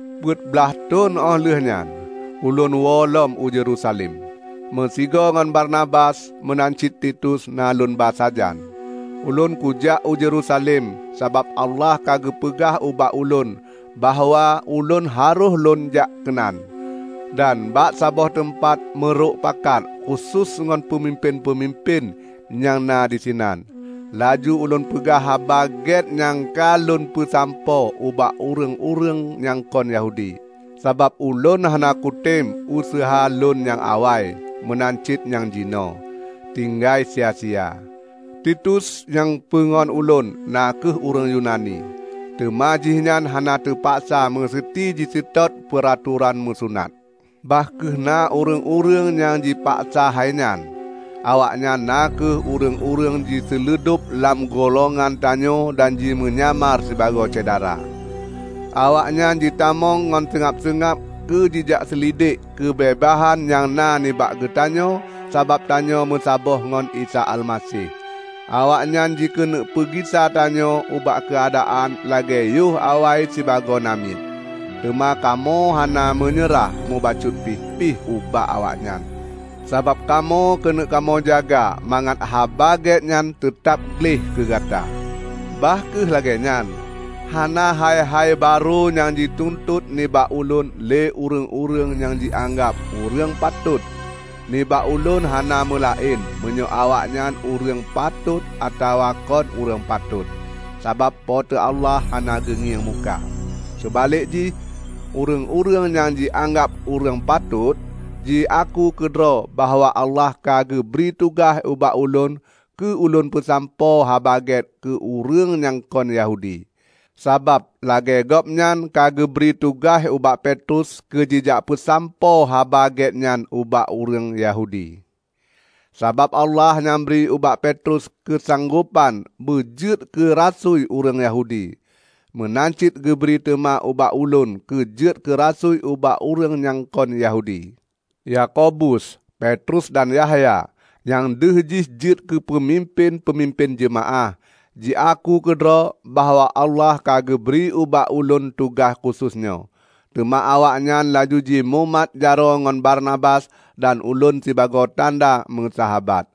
Peuet blaih thon óh lheueh nyan, ulôn woelom u Yerusalem, meusigoe ngon Barnabas. Meunan cit Titus na lôn ba sajan. Ulôn kujak u Yerusalem sabab Allah ka geupeugah ubak ulôn bahwa ulôn harôh lônjak keunan. Dan bak saboh teumpat meurok pakat khusos ngon peumimpén-peumimpén nyang na disinan, laju ulôn peugah Haba Gét nyang ka lôn peusampoe ubak ureuëng-ureuëng nyang kon Yahudi. Sabab ulôn hana kutem useuha lôn nyang awai, meunan cit nyang jinoe, tinggai sia-sia. Titus, nyang peungon ulôn, na kheueh ureuëng Yunani, teuma jihnyan hana teupaksa meuseuti jiseutôt peuratoran meusunat, bah kheueh na ureuëng-ureuëng nyang jipaksa hai nyan. Awaknyan na kheueh ureuëng-ureuëng jiseuludob lam gulongan tanyoe dan jimeunyamar sibagoe syedara. Awaknyan jitamong ngon seungab-seungab keu jijak seulidek keubeubaihan nyang na nibak geutanyoe sabab tanyoe meusaboh ngon Isa Almaseh. Awaknyan jikeuneuk peugisa tanyoe ubak keuadaan lagée yoh awai sibagoe namiet, teuma kamoe hana meunyeurah mubacut pih ubak awaknyan, sabab kamoe keuneuk kamoe jaga mangat Haba Gét nyan teutab gleh keugata. Bah kheueh lagée nyan, hana hai-hai barô nyang jituntot nibak ulôn lé ureuëng-ureuëng nyang jianggab ureuëng patot -- nibak ulôn hana meulaén meunyoe awaknyan ureuëng patot atawa kon ureuëng patot, sabab Po teu Allah hana geungieng muka. Seubalek jih, ureuëng-ureuëng nyang jianggab ureuëng patot jiaku keudroe bahwa Allah ka geubri tugaih ubak ulôn keu lôn peusampoe Haba Gét keu ureuëng nyang kon Yahudi, sabab lagée Gobnyan ka geubri tugaih ubak Petrus keujijak peusampoe Haba Gét nyan ubak ureuëng Yahudi. Sabab Allah nyang bri ubak Petrus keusanggopan beujeuet keu rasui ureuëng Yahudi, meunan cit geubri teuma ubak ulôn keujeuet keurasui ubak ureuëng nyang kon Yahudi. Yakobus, Petrus dan Yahya, nyang deuh jih jeuet keupeumimpén-peumimpén jeumaáh, jiaku keudroe bahwa Allah ka geubri ubak ulôn tugaih khusos nyoe. Teuma awaknyan laju jimumat jaroe ngon Barnabas dan ulôn sibagoe tanda meusahabat.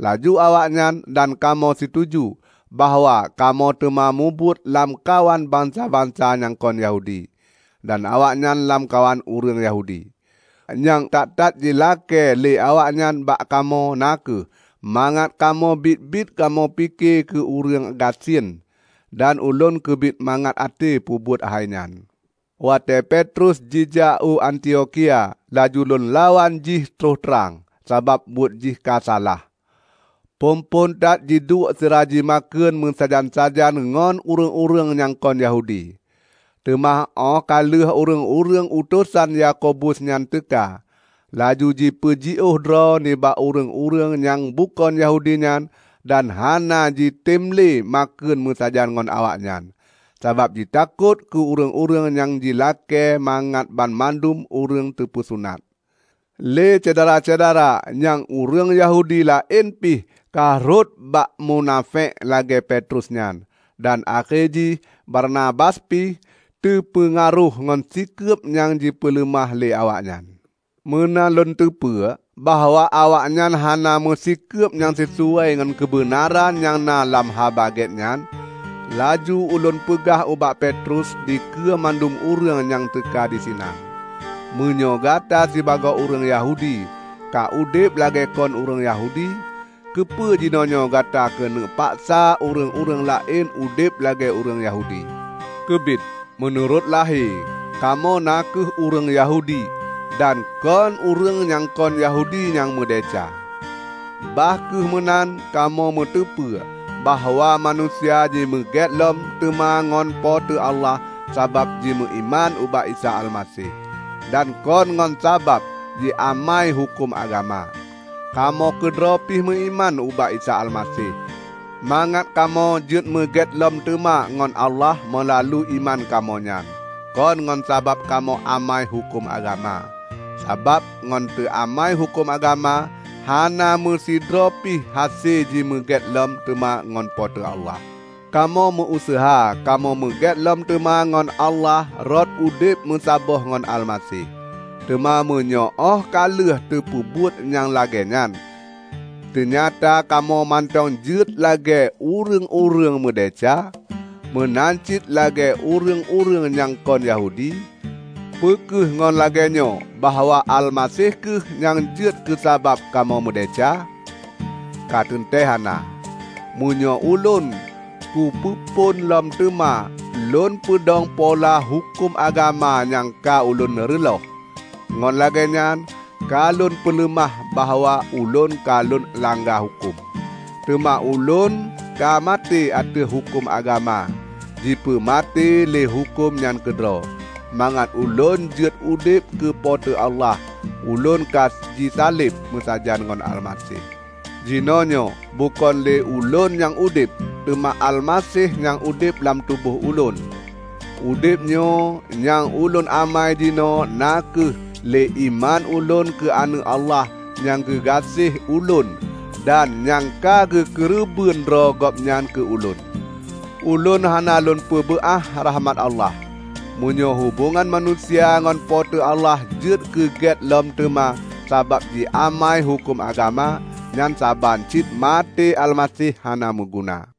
Laju awaknyan dan kamoe situju bahwa kamoe teuma mubuet lamkawan bansa-bansa nyang kon Yahudi, dan awaknyan lamkawan ureuëng Yahudi. Nyang that-that jilakée lé awaknyan bak kamoe na kheueh mangat kamoe biet-biet kamoe pike keu ureuëng gasien. Dan ulôn keubiet mangat até peubuet hai nyan. Watée Petrus jijak u Antiokhia, laju lôn lawan jih troh trang, sabab buet jih ka salah. Phon-phon that jiduek sira jimakheun meusajan-sajan ngon ureuëng-ureuëng nyang kon Yahudi. Teuma óh ka lheueh ureuëng-ureuëng utosan Yakobus nyan teuka, laju jipeujiôh droe nibak ureuëng-ureuëng nyang bukon Yahudi nyan dan hana jitem lé makheun meusajan ngon awaknyan, sabab jitakot keu ureuëng-ureuëng nyang jilakée mangat banmandum ureuëng teupeusunat. Lé syedara-syedara nyang ureuëng Yahudi laén pih ka rhot bak munafék lagée Petrus nyan, dan akhé jih Barnabas pih teupeungaroh ngon sikeub nyang jipeuleumah lé awaknyan. Meunan lôn teupeu bahwa awaknyan hana meusikeub nyang sisuai ngon keubeunaran nyang na lam Haba Gét nyan, laju ulôn peugah ubak Petrus dikeue mandum ureuëng nyang teuka disinan, "Meunyoe Gata sibagoe ureuëng Yahudi ka udeb lagée kon ureuëng Yahudi, keupeue jinoenyoe Gata keuneuk paksa ureuëng-ureuëng laén udeb lagée ureuëng Yahudi?" Keubiet, meunurot lahé, kamoe na kheueh ureuëng Yahudi dan kon "ureuëng nyang kon Yahudi nyang meudesya". Bah kheueh meunan kamoe meuteupeue bahwa manusia jimeugét lom teuma ngon Po teu Allah sabab jimeuiman ubak Isa Almaseh, dan kon ngon sabab jiamai huköm agama. Kamoe keudroe pih meuiman ubak Isa Almaseh, mangat kamoe jeuetmeugét lom teuma ngon Allah meulalu iman kamoe nyan, kon ngon sabab kamoe amai huköm agama. Sabab ngon teuamai huköm agama, hana meusidroe pih hase jimeugét lom teuma ngon Po teu Allah. Kamoe meu-useuha kamoe meugét lom teuma ngon Allah rot udeb meusaboh ngon Almaseh. Teuma meunyoe óh ka lheueh teupeubuet nyang lagée nyan, teunyata kamoe mantong jeuet lagée "ureuëng-ureuëng meudesya" meunan cit lagée ureuëng-ureuëng nyang kon Yahudi, peu kheueh ngon lagée nyoe bahwa Almaseh kheueh nyang jeuet keusabab kamoe meudesya? Ka teuntée hana! Meunyoe ulôn kupeuphon lom teuma lôn peudong pola huköm agama nyang ka ulôn reuloh, ngon lagée nyan ka lôn peuleumah bahwa ulôn ka lôn langga huköm. Teuma ulôn ka maté ateueh huköm agama -- jipeumaté lé huköm nyan keudroe -- mangat ulôn jeuet udeb keu Po teu Allah. Ulôn ka jisaleb meusajan ngon Almaseh. Jinoenyoe bukon lé ulôn nyang udeb, teuma Almaseh nyang udeb lam tuboh ulôn. Udeb nyoe nyang ulôn amai jinoe na kheueh lé iman ulôn keu Aneuëk Allah nyang geugaséh ulôn dan nyang ka geukeureubeuen droe Gobnyan keu ulôn. Ulôn hana lôn peubeuah rahmat Allah. Meunyoe hubongan manusia ngon Po teu Allah jeuet keu gét lom teuma sabab jiamai huköm agama, nyan saban cit maté Almaseh hana meuguna!